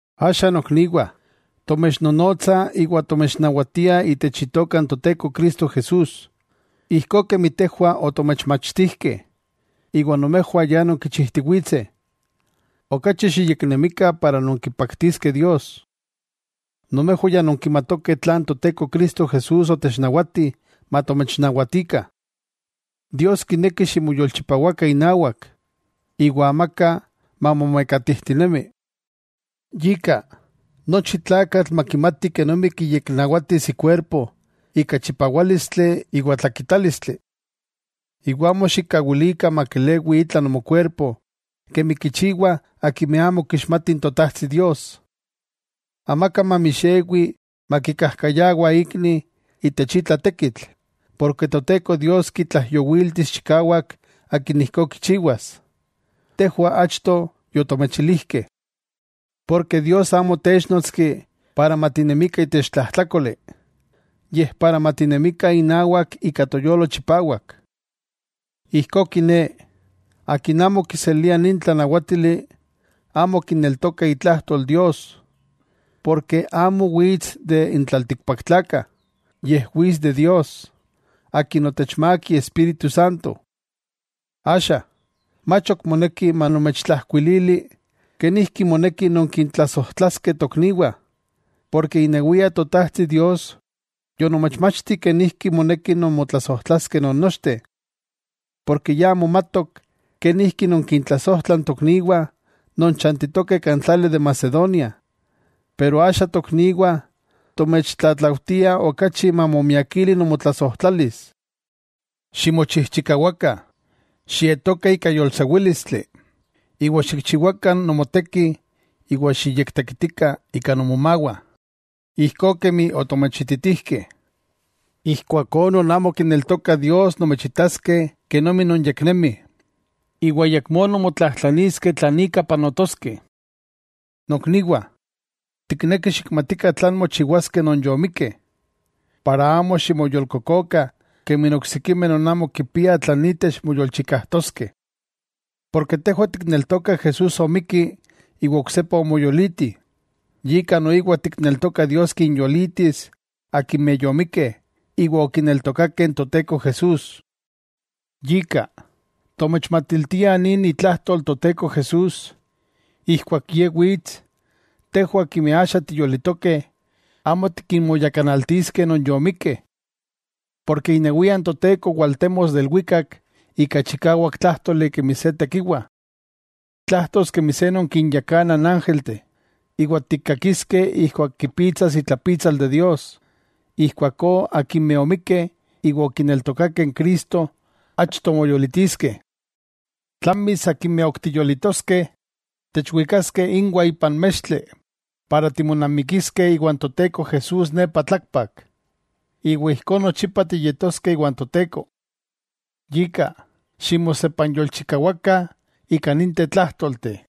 Axa nokniwah, tomechnonotsah iwa tomechnawatiah itech Itoka n Toteko Cristo Jesús, ijkó kemi tejwah otomechmachtijkeh iwa nomejwah ya nonkichijtiwitseh, okachi xiyeknemikah para nonkipaktiskeh Dios. Nomejwah ya nonkimatokeh tlan Toteko Cristo Jesús otechnawati matomechnawatikah. Dios kineki ximoyolchipawakah inawak, iwa amaka mamomekatijtinemi. Yika, nochi tlakatl makimati kenomi kiyeknawatis ikuerpo ika chipawálistli iwa tlakitálistli. Iwa amo xikkawilikah makelewi itla nomokuerpo kemi kichiwah akimeh amo kixmatih n Totajtsi Dios. Amaka mamixewi makikajkayawa ikni itech itla tekitl, porke Toteko Dios kitlaijyowiltis chikawak akin ijkó kichiwas, tejwah achto yotomechilijkeh. Porke Dios amo otéchnotski para matinemikah itech tlajtlákoli, yej para matinemikah inawak ika toyolo chipawak. Ijkó kiné, akin amo kiselia nin tlanawátili, amo kineltoka itlajtol Dios, porke amo wits de n tlaltikpaktlakah, yej wits de Dios, Akin otechmák Iespíritu Santo. Axa, mach ok moneki manomechtlajkuilili, kenijki moneki nonkintlasojtlaskeh tokniwah, porke inewia Totajtsi Dios yonomechmachti kenijki moneki nonmotlasojtlaskeh non nochteh. Porke ya momatok kenijki nonkintlasojtlah n tokniwah non chantitokeh kan tlali de Macedonia. Pero axa tokniwah, tomechtlatlaujtiah okachi mamomiakili nomotlasojtlalis. Ximochijchikawakah xietokah ika yolsewílistli, iwa xikchiwakah nomoteki iwa xiyektekitikah ika nomomawah, ijkó kemi otomechititijkeh. Ijkuakó non amo kineltokah Dios nomechitaskeh kenomi nonyeknemih, iwa ayakmó nonmotlajtlaniskeh tlan ika panotoskeh. Nokniwah, tiknekih xikmatikah tlan mochiwaskeh non yomikkeh, para amo ximoyolkokokah kemi n oksikimeh non amo kipiah tlan itech moyolchikajtoskeh. Porke tejwah tikneltokah Jesús omikki iwa oksepa omoyoliti, yika noiwa tikneltokah Dios kinyolitis akimeh yomikkeh iwa okineltokakeh n Toteko Jesús. Yika, tomechmatiltiah nin itlajtol Toteko Jesús: Ijkuak Ye wits, tejwah akimeh axa tiyolitokeh, amo tikinmoyakanaltiskeh non yomikkeh. Porke inewia n Toteko waltemos de ilwikak ika chikawak tlájtoli kemi se tekiwa. Tlajtos kemi se non kinyakana n ángelteh, iwa tikkakiskeh ijkuak kipitsas itlapitsal Dios, ijkuakó akimeh omikkeh iwa okineltokakeh n Cristo achto moyolitiskeh. Tlamis akimeh ok tiyolitoskeh, techwikaskeh inwah ipan mextli para timonamikiskeh iwan Toteko Jesús nepa tlakpak. Iwa ijkó nochipa tiyetoskeh iwan Toteko. Yika, ximosepanyolchikawakah ika ninteh tlájtolteh.